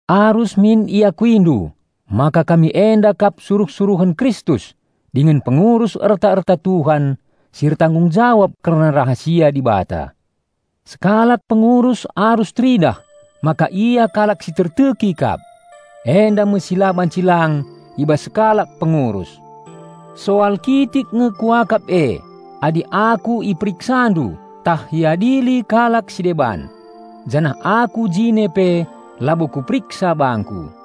Arus min iakuindu maka kami enda kap suruh-suruhen Kristus dingen pengurus erta-erta Tuhan si ertanggung jawab kerna rahasia Dibata. Sekalak pengurus arus teridah maka ia kalak si terteki kap. Enda me si la banci lang i bas sekalak pengurus. Soal kitik nge kuakap e adi aku iperiksandu tah iadili kalak si deban. Janah aku jine pe labo kuperiksa bangku.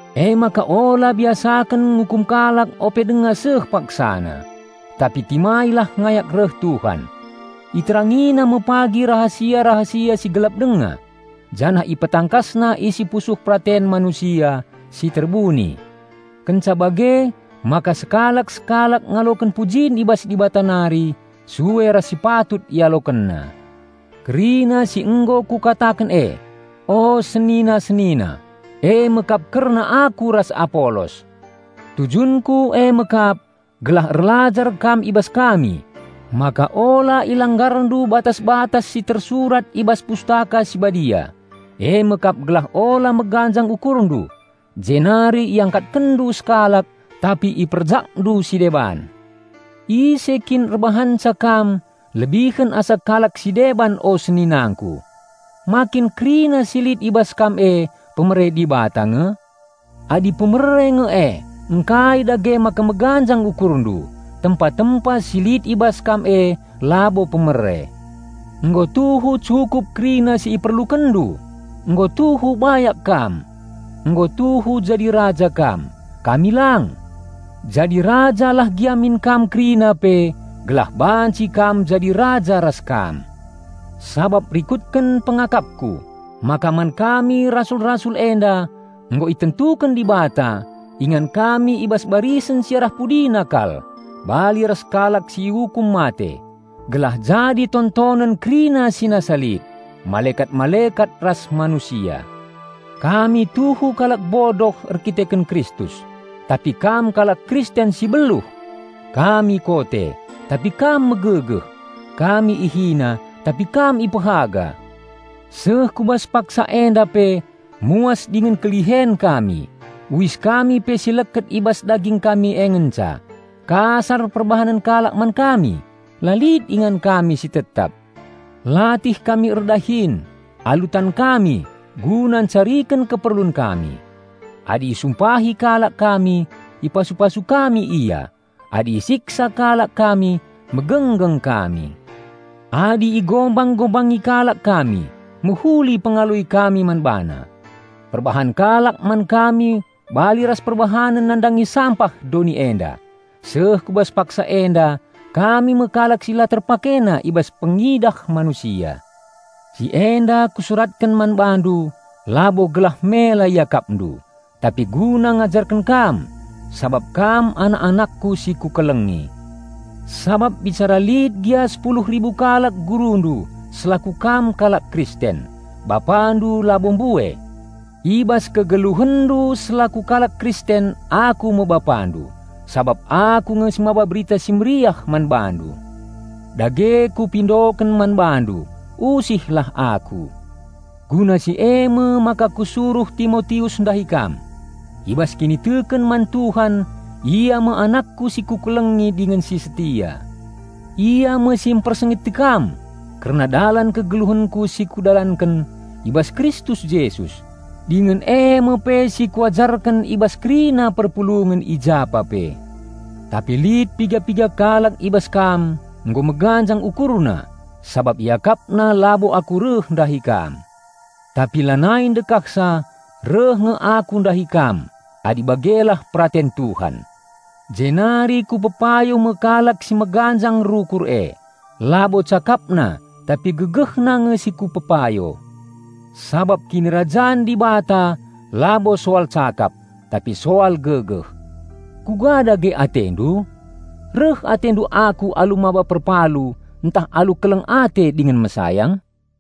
Emaka ula biasaken ngukum kalak ope denga seh paksana, tapi timailah ngayak reh Tuhan. Iterangina me pagi rahasia-rahasia si gelap denga, janah ipetangkasna isi pusuh peraten manusia si terbuni. Kenca bage maka sekalak-sekalak ngaloken pujin i bas Dibata nari sue ras si patut ialokenna. Kerina si nggo kukataken e, o senina-senina, eme kap kerna aku ras Apolos. Tujunku eme kap gelah erlajar kam i bas kami, maka ula ilanggarndu batas-batas si tersurat i bas Pustaka Si Badia, eme kap gelah ula meganjang ukurndu jenari iangkatkenndu sekalak tapi iperjakndu si deban. Ise kin erbahanca kam lebihen asa kalak si deban o seninangku? Ma kin kerina si lit i bas kam e pemere Dibata nge? Adi pemere nge e, ngkai dage maka meganjang ukurndu, tempa-tempa si lit i bas kam e labo pemere? Nggo tuhu cukup kerina si iperlukenndu! Nggo tuhu bayak kam! Nggo tuhu jadi raja kam; kami lang! Jadi raja lah gia min kam kerina pe, gelah banci kam jadi raja ras kam. Sabap rikutken pengakapku, maka man kami rasul-rasul enda nggo itentuken Dibata ingan kami i bas barisen si arah pudina kal, bali ras kalak si iukum mate, gelah jadi tontonen kerina si nasa lit, malekat-malekat ras manusia. Kami tuhu kalak bodoh erdandanken Kristus; tapi kam kalak Kristen si beluh! Kami kote, tapi kam megegeh! Kami ihina, tapi kam ipehaga! Seh ku bas paksa enda pe muas dingen kelihen kami; uis kami pe si leket i bas daging kami e ngenca; kasar perbahanen kalak man kami; la lit ingan kami si tetap. Latih kami erdahin alu tan kami guna encariken keperlun kami. Adi isumpahi kalak kami, ipasu-pasu kami ia; adi isiksa kalak kami, megenggeng kami. Adi igombang-gombangi kalak kami, mehuli pengaloi kami man bana. Perbahan kalak man kami bali ras perbahanenna nandangi sampah doni enda; seh ku bas paksa enda kami me kalak si la terpakena i bas pengidah manusia. Si enda kusuratken man bandu labo gelah mela iakapndu, tapi guna ngajarken kam sabap kam anak-anakku si kukelengi. Sabap bicara lit gia sepuluh ribu kalak gurundu selaku kam kalak Kristen, bapandu labo mbue. I bas kegeluhenndu selaku kalak Kristen aku me bapandu, sabap aku nge si maba Berita Si Mehuli man bandu. Dage kupindoken man bandu: Usihlah aku. Guna si eme maka kusuruh Timotius ndahi kam. I bas kiniteken man Tuhan ia me anakku si kukelengi dingen si setia. Ia me si mpersingeti kam kerna dalan kegeluhenku si kudalanken i bas Kristus Jesus, dingen eme pe si kuajarken i bas kerina perpulungen i japa pe. Tapi lit piga-piga kalak i bas kam nggo meganjang ukurna sabap iakapna labo aku reh ndahi kam. Tapi lanai ndekahsa reh nge aku ndahi kam adi bagelah peraten Tuhan. Jenari kupepayo me kalak si meganjang rukur e, labo cakapna tapi gegehna nge si kupepayo. Sabap Kinirajan Dibata labo soal cakap, tapi soal gegeh. Kuga dage atendu? Reh atendu aku alu maba perpalu, ntah alu keleng ate dingen mesayang?